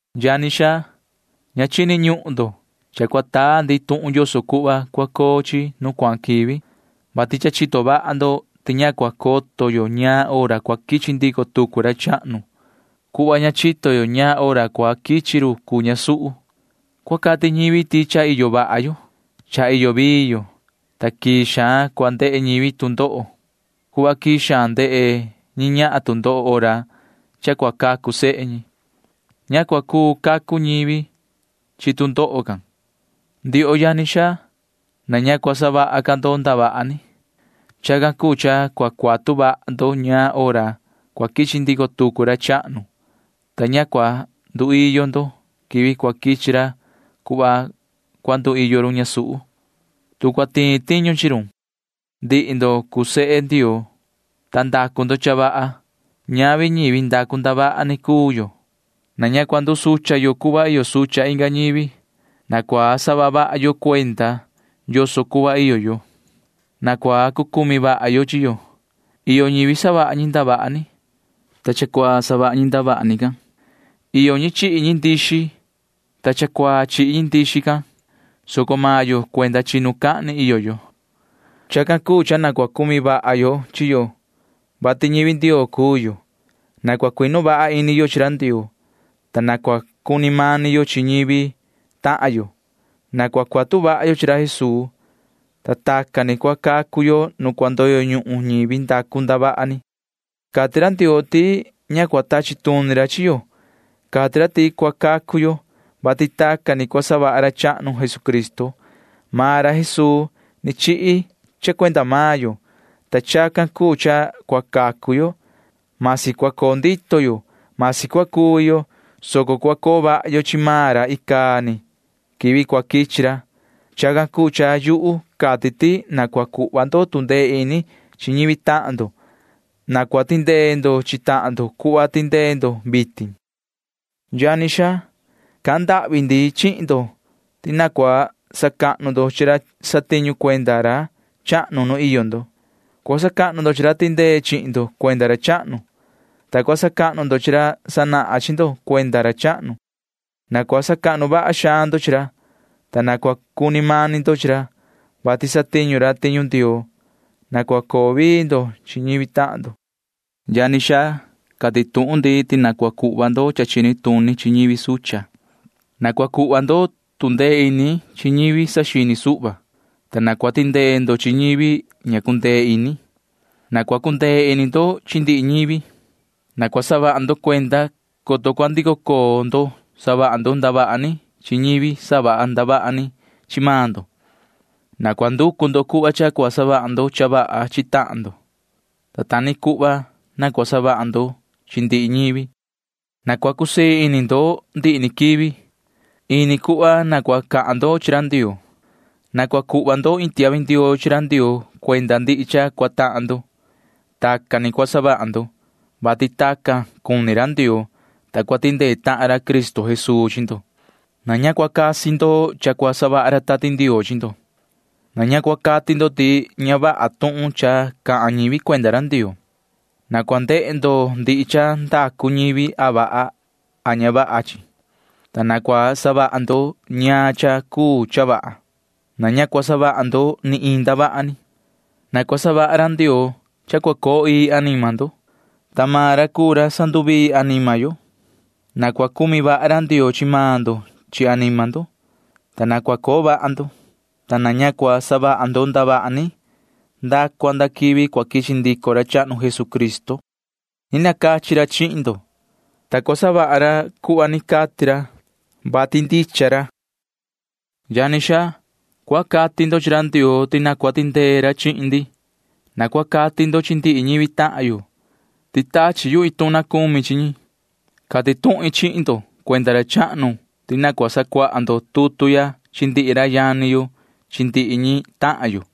Yani xaa, ña chini ñuhun ndo cha cua taa ndi tuhun yoso cuhva cua coo chi nu cuahan quivi, vati cha chito vaha ndo ti ña cua coto yo ñaan hora cua quichi ndico tucu ra chahnu cuhva ña chito yo ñaan hora cua quichi run cuu ñasuhu. Cua cati ñivi ti cha iyo vaha yo, cha iyo vii yo, ta quii xaan cua ndehe ñivi tu ndoho cuhva quii xaan ni quichi tu ndoho chi ñi ñahan hora cha cua cacu sehe ñi. Ña cua cuu cacu ñivi chi tu ndoho can. Ndioho yani xaa, na ña cua savaha ca ndo ndavaha ni. Chacan cuu cha cua cuatu vaha ndo ñaan hora cua quichi ndico tucu ra chahnu, ta ña cua nduiyo ndo quivi cua quichi ra cuhva cua nduiyo run ñasuhu, [tu cua tiin tiñu chi run]. Ndihi ndo cuu sehe Ndioo, ta ndacu ndo cha vaha. Ñavi ñivi ndacu ndavaha ni cuu yo. Na ña cua ndusucha yo cuhva iyo sucha inga ñivi, soco na cua saha yo cuenda yoso cuhva iyo yo. Na cua cucumi vaha yo chi yo. Iyo ñivi savaha ndavaha ni, ta cha cuaa savaha ñi ndavaha ni can. Iyo ñi chihi ndixi, ta cha cuaa chihi ñi ndixi can. Cha iyo maan yo cuenda chinucahni. Chacan cuu cha na cua cucumi vaha yo chi yo, vati ñivi Ndioo cuu yo. Na cua cuinu vaha ini yo chi ra Ndioo, ta na cua cuni mani yo chi ñivi tahan yo. Na cua cuatu vaha yo chi ra Jesuu, [ta tacan ni cua cacu yo nu cua ndoyo ñuhun ñivi ndacu ndavaha ni]. Cati ra Ndioo ti ña cua tachi tuni ra chi yo. Cati ra ti cua cacu yo, vati tacan ni cua savaha ra chahnu Jesucristo. Maan ra Jesuu ni chihi cha cuenda maan yo, ta chacan cuu cha cua cacu yo. Vasi cua coo ndito yo, vasi cua cuvi yo, soco cua coo vaha yo chi maan ra icaa ni quivi cua quichi ra. Chacan cuu cha yu cati ti na cua cuhva ndo tu ndee ini chi ñivi tahan ndo. Na cua tindee ndo chi tahan ndo cuhva tindee ndo vitin. Yani xaa, cahan ndahvi ndi chihin ndo ti na cua sacahnu ndo chi ra satiñu cuenda ra chahnu nu iyo ndo. Cua sacahnu ndo chi ra tindee chihin ndo cuenda ra chahnu, ta cua sacahnu ndo chi ra sanahan chi ndo cuenda ra chahnu. Na cua sacahnu vaha xaan ndo chi ra, ta na cua cuni mani ndo chi ra, vati satiñu ra tiñu Ndioo. Na cua coo vii ndo chi ñivi tahan ndo. Yani xaa, cati tuhun ndi ti na cua cuhva ndo cha chini tuni chi ñivi sucha. Na cua cuhva ndo tu ndee ini chi ñivi saxini suhva, ta na cua tindee ndo chi ñivi ña cundee ini. Na cua cundee ini ndo chi ndihi ñivi. Na cua saha ndo cuenda, coto cua ndico coo ndo savaha ndo ndavaha ni chi ñivi savaha ndavaha ni chihin maan ndo. Na cua nducu ndo cuhva cha cua savaha ndo cha vaha chi tahan ndo, ta ta ni cuhva na cua savaha ndo chi ndihi ñivi. Na cua cusii ini ndo ndihi ni quivi. Ini cuhva na cua cahan ndo chi ra Ndioo. Na cua cuhva ndo iin tiahvi ndioo chi ra Ndioo cuenda ndihi cha cua tahan ndo. Tacan ni cua savaha ndo, vati tacan ni cuni ra Ndioo, ta cua tindee tahan ra Cristo Jesuu chi ndo. Na ña cua casi ndo cha cua savaha ra Tati Ndioo chi ndo. Na ña cua cati ndo ti ña vaha tuhun cha cahan ñivi cuenda ra Ndioo. Na cua ndehe ndo ndihi cha ndacu ñivi a vaha a ña vaha chi, ta na cua savaha ndo ñaan cha cuu cha vaha. Na ña cua savaha ndo ni iin ndavaha ni. Na cua savaha ra Ndioo cha cua coo ii anima ndo, ta maan ra cuu ra sanduvii anima yo. Na cua cumi vaha ra Ndioo chi maan ndo chi anima ndo. Na cua coo vaha ndo, ta na ña cua savaha ndo ndavaha ni nda cua nda quivi cua quichi ndico ra chahnu Jesucristo. Ni nacachi ra chihin ndo, ta cua savaha ra cuhva ni cati ra, vati cha ndicha ra. Yani xaa, cua cati ndo chi ra Ndioo ti na cua tindee ra chihin ndi. Na cua cati ndo chi ndihi ñivi tahan yo ti tachi yu iin tuhun na cumi chi ñi. Cati tuhin chihin ndo cuenda ra chahnu ti na cua sacuaha ndo tutu ya chi ndihi ra yani yo chi ndihi ñi tahan yo.